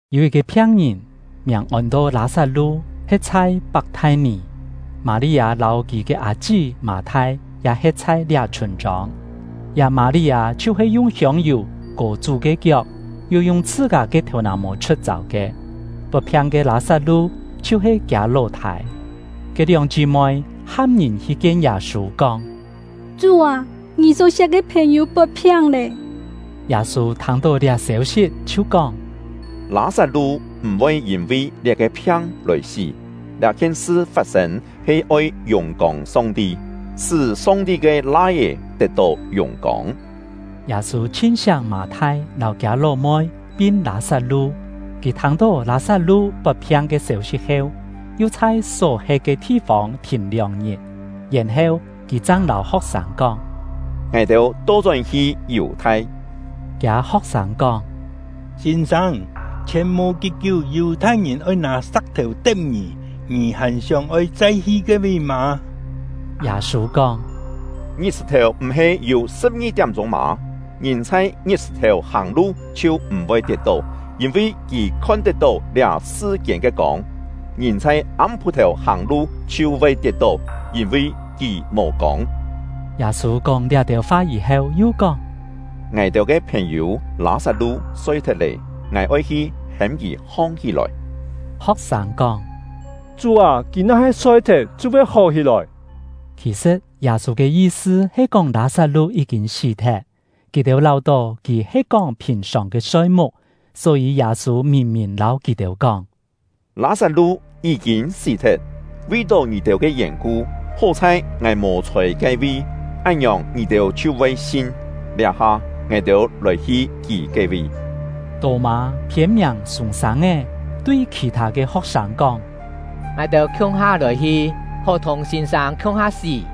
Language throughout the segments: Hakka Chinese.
Yû yit-ke phiang-ngìn, miàng ôn-to Lâ-sat-lu, he̍t chhai Pak-thai-nì; Mâ-li-â lâu kì ke â-chí Mâ-thai ya he̍t chhai liá chhûn-chông. (Liá Mâ-li-â chhiu-he yung hiông-yù kò Chú ke kiok, yu yung chhṳ-kâ ke thèu-nà-mô chhu̍t-châu ke. Pot-phiang ke Lâ-sat-lu chhiu-he kiâ ló-thâi.) Ke lióng chí-moi ham ngìn hi kien Yâ-sû, kóng: “Chú â, ngì só-siak ke phèn-yû pot-phiang lé.” Yâ-sû thâng-tó liá sêu-sit chhiu kóng: “Lâ-sat-lu m̀ voi yîn-vi liá-ke phiang lòi sí; liá-khien sṳ fat-sên he oi yùng-kông Song-ti, sṳ́ Song-ti ke Lai-é tet-tó yùng-kông.” Yâ-sû chhin-siak Mâ-thai lâu kiâ ló-moi, pin Lâ-sat-lu. Kì thâng-tó Lâ-sat-lu pot-phiang ke sêu-sit heu, yu chhai só-he̍t ke thi-fông thìn lióng-ngit. Yèn-heu kì chang lâu ho̍k-sâng kóng: “Ngài-têu to-chón-hi Yù-thai.” Kiâ ho̍k-sâng kóng: “Sîn-sâng, chhièn mò kí-kiú, Yù-thai-ngìn oi nâ sa̍k-thèu te̍p ngì, ngì hàn sióng-oi chai hi ke-vi mâ?” Yâ-sû kóng: “Ngit-sṳ̀-thèu m̀-he yû sṳ̍p-ngi tiám-chûng mâ? Ngìn chhai ngit-sṳ̀-thèu hàng-lu chhiu m̀-voi tiet-tó, yîn-vi kì khon-tet-tó liá sṳ-kiên ke kông. Ngìn chhai am-pû-thèu hàng-lu chhiu voi tiet-tó, yîn-vi kì mò kông.” Yâ-sû kóng liá-têu fa yî-heu, yu kóng: “Ngài-têu ke phèn-yû Lâ-sat-lu soi-thet lé; ngài oi hi hêm kì hong-hí-lòi.” Ho̍k-sâng kóng: “Chú â, kì na-he soi-thet, chhiu voi hó hí-lòi.” Khì-sṳ̍t, Yâ-sû ke yi-sṳ he kóng Lâ-sat-lu yí-kîn sí-thet; kì-têu láu-tó kì he kóng phìn-sòng ke soi-muk. Só-yî Yâ-sû mìn-mìn lâu kì-têu kóng: “Lâ-sat-lu yí-kîn sí-thet; vi-tó ngì-têu ke yèn-ku, hó-chhai ngài mò-chhôi ke-vi, án-ngiòng ngì-têu chhiu voi sin. Liá-ha, ngài-têu lòi-hi kì ke-vi.” Tô-mâ (phiên-miàng Sûng-sâng-é) tui khì-thâ ke ho̍k-sâng kóng: “Ngài-têu khiung-ha lòi-hi, hó thùng sîn-sâng khiung-ha sí!”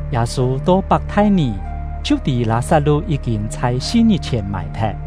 Yâ-sû to Pak-thai-nì, chhiu tî Lâ-sat-lu yí-kîn chhai si-ngit-chhièn mài-thet.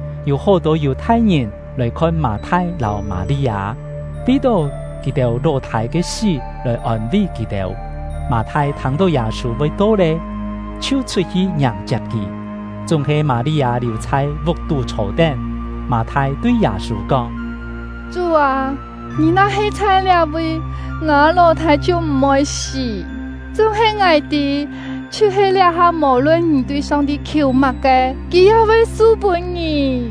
yû hó-tô Yù-thai-ngìn lòi-khon Mâ-thai lâu Mâ-li-â, vi-tó kì-têu ló-thâi ke sí lòi ôn-ví kì-têu. Mâ-thai thâng-tó Yâ-sû voi to lé, chhiu chhut-hi ngiàng-chiap kì; chúng-he Mâ-li-â liù chhai vuk-tú chhô-tén. Mâ-thai tui Yâ-sû kóng: “Chú â, ngì na-he chhai liá-vi, ngâ ló-thâi chhiu m̀ voi sí! Chúng-he ngài tî, chhiu-he liá-ha, mò-lun ngì tui Song-ti khiù má-ke, Kì ya voi su-pûn ngì.”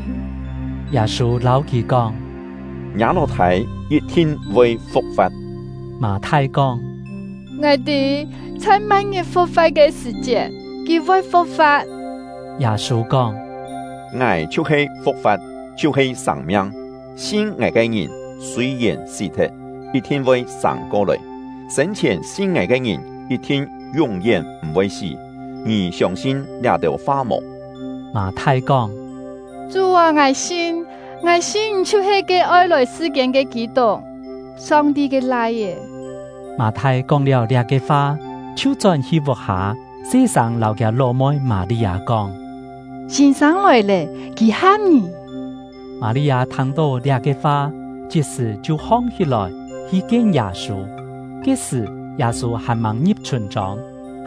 Yâ-sû lâu kì kóng: “Ngiâ ló-thâi yit-thin voi fu̍k-fa̍t.” Mâ-thai kóng: “Ngài tî, chhai ma̍t-ngit fu̍k-fa̍t ke sṳ̀-chiet, kì voi fu̍k-fa̍t.” Yâ-sû kóng: “Ngài chhiu-he fu̍k-fa̍t, chhiu-he sâng-miang. Sin ngài ke ngìn, sûi-yèn sí-thet, yit-thin voi sâng ko-lòi; sên-chhièn sin ngài ke ngìn yit-thin yún-yén m̀-voi sí. Ngì siông-sin liá-têu fa mò?” Mâ-thai kóng: “Chú â, ngài sin! Ngài sin ngì chhiu-he ke oi lòi sṳ-kiên ke Kî-tuk, Song-ti ke Lai-é.” Mâ-thai kóng-liáu liá-ke fa, chhiu chón-hi vuk-hâ, se-sâng lâu kiâ ló-moi Mâ-li-â kóng: “Sîn-sâng lòi lé, kì ham ngì.” Mâ-li-â thâng-tó liá-ke fa, chit-sṳ̀ chhiu hong-hí-lòi, hi kien Yâ-sû. (Ke-sṳ̀, Yâ-sû hàn-màng ngi̍p chhûn-chông,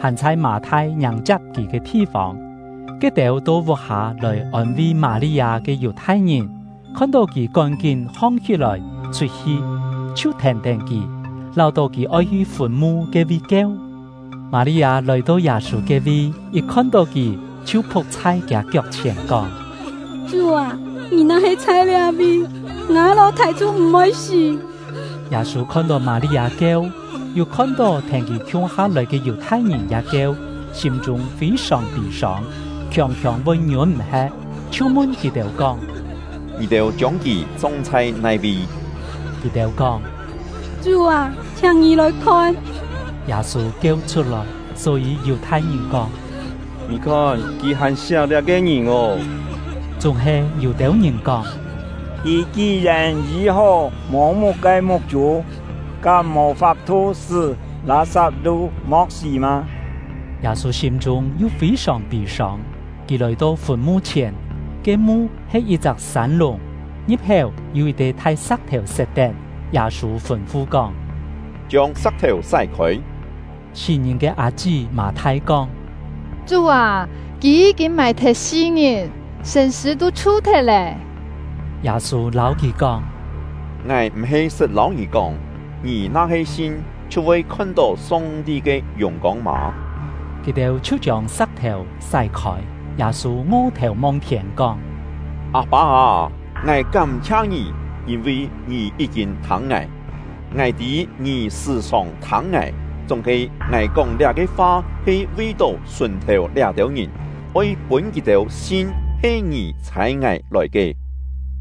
hàn chhai Mâ-thai ngiàng-chiap kì ke thi-fông.) Ke-têu to vuk-hâ lòi ôn-ví Mâ-li-â ke Yù-thai-ngìn, khon-tó kì kón-kín hong-hí-lòi chhut-hi, chhiu thèn-tén kì, láu-tó kì oi hi fùn-mu ke-vi kieu. Mâ-li-â lòi-to Yâ-sû ke-vi, yit khon-tó kì, chhiu phu̍k chhai kiâ kiok-chhièn, kóng: “Chú â, ngì na-he chhai liá-vi, ngâ ló-thâi chhiu m̀-voi sí!” Yâ-sû khon-tó Mâ-li-â kieu, yu khon-tó thèn kì khiung-ha lòi ke Yù-thai-ngìn ya kieu, sîm-chûng fî-sòng pî-sông, khiòng-khiòng voi ngiûn-m̀-he̍t, chhiu mun kì-têu kóng: “Ngì-têu chiông kì chong chhai nai-vi?” Kì-têu kóng: “Chú â, chhiáng ngì lòi khon.” Yâ-sû kieu chhut-lòi. Só-yî Yù-thai-ngìn kóng: “Ngì khon, kì hàn siak liá-ke ngìn ô!” Chúng-he yû-têu ngìn kóng: “Kì ki-yèn yî-hó mô-muk ke muk-chû, kám mò fap-thu sṳ́ Lâ-sat-lu mo̍k sí mâ?” Yâ-sû sîm-chûng yu fî-sòng pî-sông. Kì lòi-to fùn-mu-chhièn; ke mu he yit-chak sân-lùng, ngi̍p-héu yû yit-te thai sa̍k-thèu set-tén. Yâ-sû fûn-fu kóng: “Chiông sa̍k-thèu sái-khôi!” Sí-ngìn ke â-chí Mâ-thai kóng: “Chú â, kì yí-kîn mài-thet si-ngit, sṳ̂n-sṳ̂ tû chhu-thet lê!” Yâ-sû lâu kì kóng: “Ngài m̀-he sṳt lâu ngì kóng, ngì na-he sin, chhiu voi khon-tó Song-ti ke yùng-kông mâ?” Kì-têu chhiu chiông sa̍k-thèu sái-khôi. Yâ-sû ngo-thèu mong-thiên, kóng: “Â-pâ â, ngài kám-chhia Ngì, yîn-vi Ngì yí-kîn thâng ngài. Ngài tî Ngì sṳ̀-sòng thâng ngài; chúng-he ngài kóng liá-ke fa he vi-tó sùn-thèu liá-têu ngìn, oi pûn kì-têu sin he Ngì chhâi ngài lòi ke.”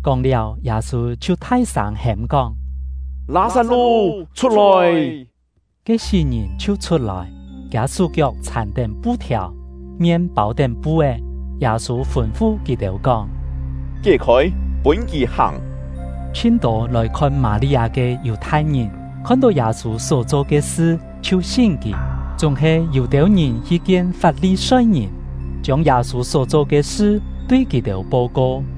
Kóng-liáu, Yâ-sû chhiu thai-sâng hêm-kóng: “Lâ-sat-lu, chhut-lòi!” Ke sí-ngìn chhiu chhut-lòi; kiâ sú-kiok chhàn-tén pu-thiàu, mien pâu-tén pu-é. Yâ-sû fûn-fu kì-têu kóng: “Kié-khôi, pûn kì hàng!” Chhin-tô lòi khon Mâ-li-â ke Yù-thai-ngìn khon-tó Yâ-sû só-cho ke sṳ, chhiu sin kì. Chúng-he ya yû-têu ngìn hi kien Fap-li-soi-ngìn, chiông Yâ-sû só-cho ke sṳ tui kì-têu po-ko.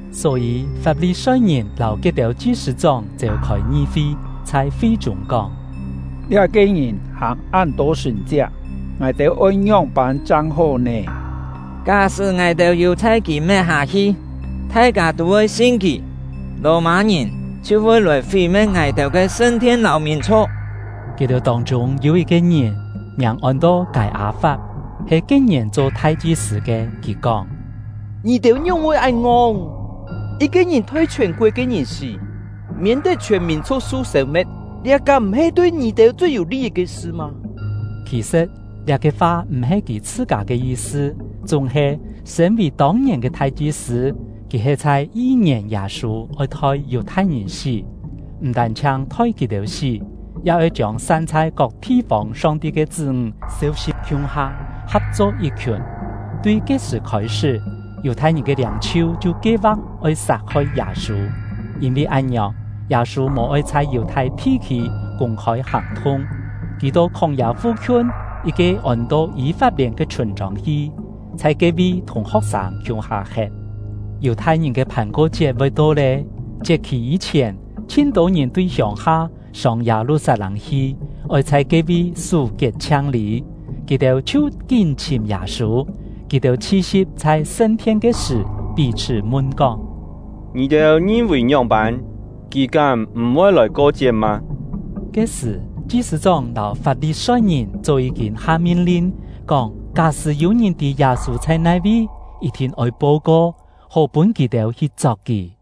Só-yî, Fap-li-soi-ngìn lâu ke-têu chi-sṳ̂-chóng seu-khôi ngi-fi, chhai fi-chûng kóng: “Liá-ke ngìn hàng án-tô sṳ̀n-chiak, ngài-têu oi ngióng-pân chang hó nè? Ká-sṳ́ ngài-têu yù-chhai kì met-hâ-hi, thai-kâ tû voi sin kì, Lò-mâ-ngìn chhiu voi lòi fí-me̍t ngài-têu ke sṳn-thien “sṳn-thien” ya-he yi̍t-cho “thú-thi”. lâu mìn-chhu̍k!” Kì-têu tông-chûng yû yit-ke ngìn, miàng ôn-to Kâi-â-fap, he ke-ngièn cho thai-chi-sṳ̂ ke. Kì kóng: “Ngì-têu ngióng-voi án ngong! Yit-ke ngìn thoi chhiòn-koet ke ngìn sí, miên-tet chhiòn mìn-chhu̍k su sêu-me̍t, liá kám m̀-he tui ngì-têu chui yû li-yit ke sṳ mâ?” Khì-sṳ̍t, liá-ke fa m̀-he kì chhṳ-kâ ke yi-sṳ; chúng-he, sṳ̂n-vì tông-ngièn ke thai-chi-sṳ̂, kì he chhai yi-ngièn Yâ-sû oi thoi Yù-thai-ngìn sí, m̀ tân-chhiang thoi kì-têu sí, ya oi chiông san chhai kok thi-fông Song-ti ke chṳ́-ńg seu-si̍p khiung-ha, kap-cho yit-khiùn. Tui ke-sṳ̀ khôi-sṳ́, Yù-thai-ngìn ke liâng-chhiu chhiu kie-va̍k oi sat-hoi Yâ-sû. Yîn-vi án-ngiòng, Yâ-sû mò-oi chhai Yù-thai thi-khî kûng-khôi hàng-thung. Kì to khóng-yâ fu-khiun yit-ke ôn-to Yî-fap-lièn ke chhûn-chông hi, chhai ke-vi thùng ho̍k-sâng khiung-ha he̍t. Yù-thai-ngìn ke Phàn-ko-chiet voi to lé. Chiet-khì yî-chhièn, chhin-tô ngìn tui hiông-ha sông Yâ-lu-sat-lâng hi, oi chhai ke-vi sú kiet-chhiang-lî. Kì-têu chhiu kín chhìm Yâ-sû; kì-têu chhi-si̍p chhai sṳn-thien ke sṳ̀, pí-chhṳ́ mun kóng: “Ngì-têu ngin-vì ngióng-pân, kì kám m̀-voi lòi ko-chiet mâ?” Ke-sṳ̀, chi-sṳ̂-chóng lâu Fap-li-soi-ngìn chó yí-kîn ha min-lin kóng: Ká-sṳ́ yû-ngìn tî Yâ-sû chhai nai-vi, yit-thin oi po-ko, hó pûn kì-têu hi chok kì.